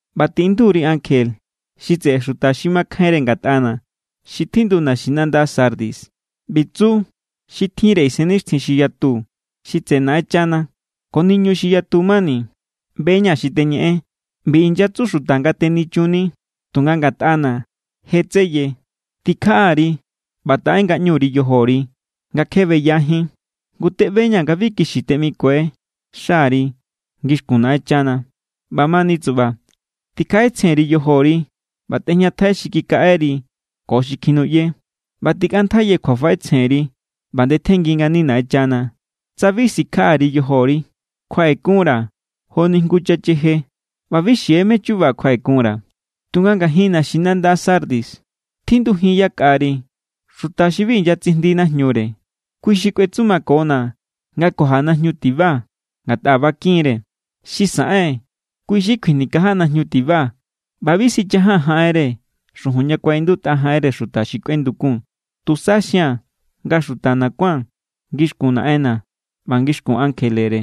’ꞌBa tiꞌindu_ri ankje xi tseꞌe xuta xi makjainre ngatꞌana̱ xi tjindu naxinanda Sardis: “ꞌBi tsu xi tjinre isennixtjin xi yatu xi tseꞌe Naꞌenchana ko niñu xi yatu mani: ꞌBe=ña̱ xi teñeꞌen. ꞌBi inyatsu xuta nga tenichunni, tunga ngatꞌana̱ je= tseye. Tikjaꞌa_ri ꞌba taꞌe ngaꞌñuri yojori nga kje beyajín, ngu teꞌbeña̱ nga bi kixi teꞌmikue xari ngixkun Naꞌenchana. ꞌBamani tsuba, tikjaꞌetsjenya_ri yojori ꞌba tꞌejñatjai xi kikaꞌeri ko xi kjinuꞌye, ꞌba tikꞌantjaiye kjuafaꞌetsjenri ꞌba ndetjenngi ngani Naꞌenchana. Tsa bi sikjaꞌa_ri yojori, kjuaꞌekunra̱ joni jngu chacheje ꞌba bi xie mé= chuba kjuaꞌekunra̱. Tunga ngajin naxinanda Sardis tjindujin yakꞌari xuta xi bi inyatsijndi najñure. Kui xi kꞌuetsumakona̱ nga kuaja najñu tiba, ngatꞌa bakin=re̱. Xi saꞌen, kui xi kjuinikaja najñu tiba ꞌba bi sichajaa̱n jaꞌenre xujun ña kuaꞌindutꞌa jaꞌenre xuta xi kꞌuendukun. Tusa xia̱n nga xutana̱ kuán ngixkun Naꞌenna̱ ꞌba ngixkun ankjelere.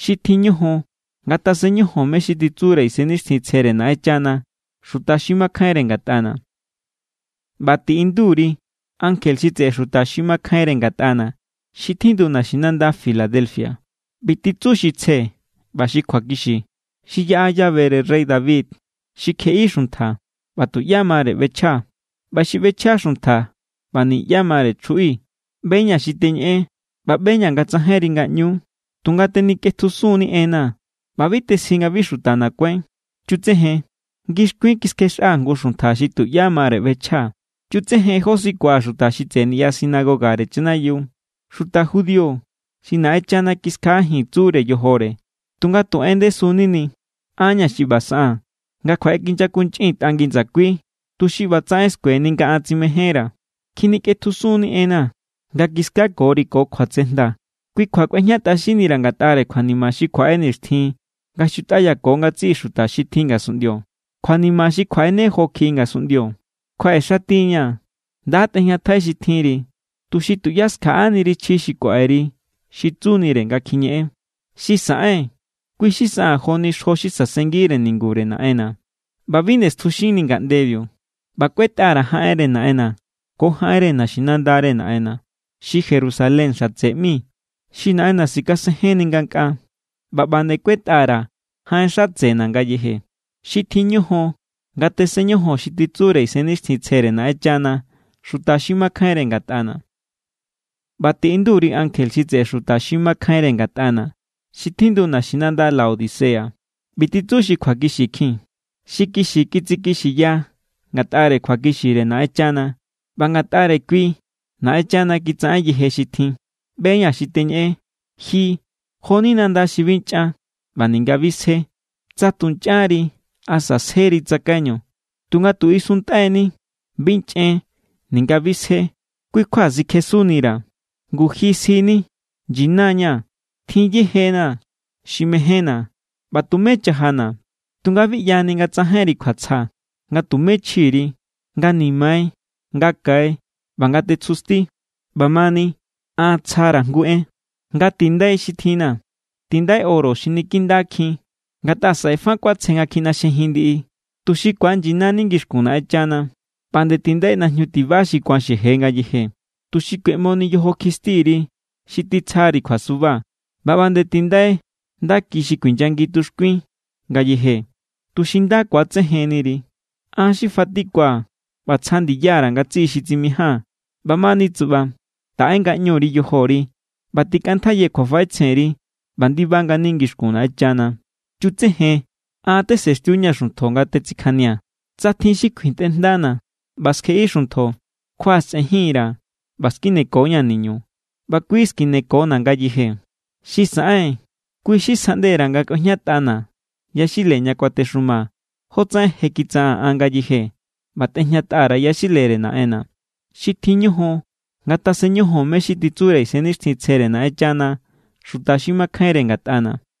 ¡Xi tjin ñojon ngatasen ñojon mé= xi titsure Isennixtjintsjere Naꞌenchana xuta xi makjainre ngatꞌana̱!” ’ꞌBa tiꞌindu_ri ankje xi tseꞌe xuta xi makjainre ngatꞌana̱ xi tjindu naxinanda Filadelfia: “ꞌBi titsu xi tsje ꞌba xi kjuakixi, xi yaꞌa llavere rey David, xi kjeꞌi xuntja, ꞌba tuꞌyá mare ꞌbechjaa̱; ꞌba xi ꞌbechja xuntja, ꞌba niꞌyá mare chjuꞌi: ꞌBe=ña̱ xi teñeꞌen ꞌba ꞌbe=ña̱ nga tsajainri ngaꞌñuú. Tunga tenikꞌetjusun=ni enna̱ ꞌba bi tesji nga bi xutana̱ kuáin. Chutsejen. Ngixkuin kiskjexꞌaa̱ jngu xuntja xi tuꞌyá mare ꞌbechjaa̱. Chutsejen jó sikua̱ xuta xi tseꞌe niꞌya sinagogare chanayiu, xuta judío xi Naꞌenchana kiskjaꞌajin tsure yojore tunga tu en ndesu=nini. An=ña̱ xi ꞌba saꞌaa̱n nga kjuaꞌekinyakunchꞌintꞌa ngi ndsakui, tuxi ꞌbatsaꞌen skueni nga an tsimejénra̱. Kjinikꞌetjusun=ni enna̱ nga kiskakori ko kjuatsejnda. Kui kjua kꞌuejñatꞌaxinnira̱ ngatꞌare kjuanima xi kjuaꞌe nixtjin nga xutꞌayako ngatsiꞌi xuta xi tjin ngasunꞌndio, kjuanima xi kjuaꞌene jo kjiꞌi ngasunꞌndio. Kjuaꞌexati=ña̱. Nda tꞌejñatjai xi tjinri, tuxi tuꞌyá skjaꞌaniri chji xi kuaꞌeri xi tsunire nga kjiñeꞌen. Xi saꞌen, kui xi saꞌaa̱n joni xjo xi sasengire ningure Naꞌenna̱, ꞌba bi nde stjuxinni ngaꞌndebiu. ꞌBa kꞌuetꞌa_ra̱ jaꞌenre Naꞌenna̱ ko jaꞌenre naxinandare Naꞌenna̱, xi Jerusalén xatse ꞌmi xi Naꞌenna̱ sikasenjenni ngankꞌaa. ꞌBa ꞌba nde kꞌuetꞌa_ra̱ jaꞌen xatsena̱ ngayeje. ¡Xi tjin ñojon ngatasen ñojon xi titsure Isennixtjintsjere Naꞌenchana xuta xi makjainre ngatꞌana̱!” ’ꞌBa tiꞌindu_ri ankje xi tseꞌe xuta xi makjainre ngatꞌana̱ xi tjindu naxinanda Laodicea: “ꞌBi titsu xi kjuakixikjin, xi kixi tsikixiya ngatꞌare kjuakixire Naꞌenchana, ꞌba ngatꞌare kui Naꞌenchana kitsaꞌen yeje xi tjin: ꞌBe=ña̱ xi teñeꞌen. Ji jo=ni nanda xi bi nchꞌan ꞌba ninga bi sje. ¡Tsa tu nchꞌanri asa sjeri tsakaiñu! Tunga tu isuntꞌai=ni. Bi nchꞌen ninga bi sje. Kui kjua sikjesunnira̱. Ngu ji sjini: Nyina=ña̱, tjin yeje=na̱ xi mejénna̱ ꞌba tumé chajana̱. Tunga bi ꞌyani nga tsajainri kjuatsja, nga tumé chji=ri, nga nimai, nga kai ꞌba nga tetsjusti. ꞌBamani an tsjara̱ jngu en nga tindai xi tjinna̱. Tindai oro xi niki nda=kjin ngatꞌa saꞌe fa kuatsje nga kjinaxjejin ndiꞌi, tuxi ku̱anyinani ngixkun Naꞌenchana. ꞌBa nde tindai najñu tiba xi ku̱an xeje ngayeje, tuxi kueꞌmoni yojo kjistiri xi titsjari kjuasuba. ꞌBa ꞌba nde tindai ndaki xi kuinyangi tuxkuin ngayeje, tuxi nda ku̱atsejenniri. An xi fatikua̱ ꞌba tsja ndiya_ra̱ ngatsiꞌi xi tsimijaa̱n. ꞌBamani tsuꞌba, taꞌe ngaꞌñuri yojori ꞌba tikꞌantjaiye kjuafaꞌetsjenri ꞌba ndiba ngani ngixkun Naꞌenchana. Chutsejen, an tesenxtiu=ña̱ xuntjo nga tetsikjania̱. Tsa tjin xi kjuintꞌe jndana̱ ꞌba skjeꞌi xuntjo, kjuaꞌasꞌenjin_ra̱ ꞌba skineko=ña̱ niñu, ꞌba kui skineko=na̱ ngayeje. Xi saꞌen, kui xi sjaꞌnde_ra̱ nga kꞌuejñatꞌana̱ yaxile ña kuatexumaa̱, jotsaꞌen je kitsaꞌaa̱n an ngayeje ꞌba tejñatꞌa_ra̱ yaxilere Naꞌenna̱. ¡Xi tjin ñojon ngatasen ñojon mé= xi titsure Isennixtjintsjere Naꞌenchana xuta xi makjainre ngatꞌana̱!”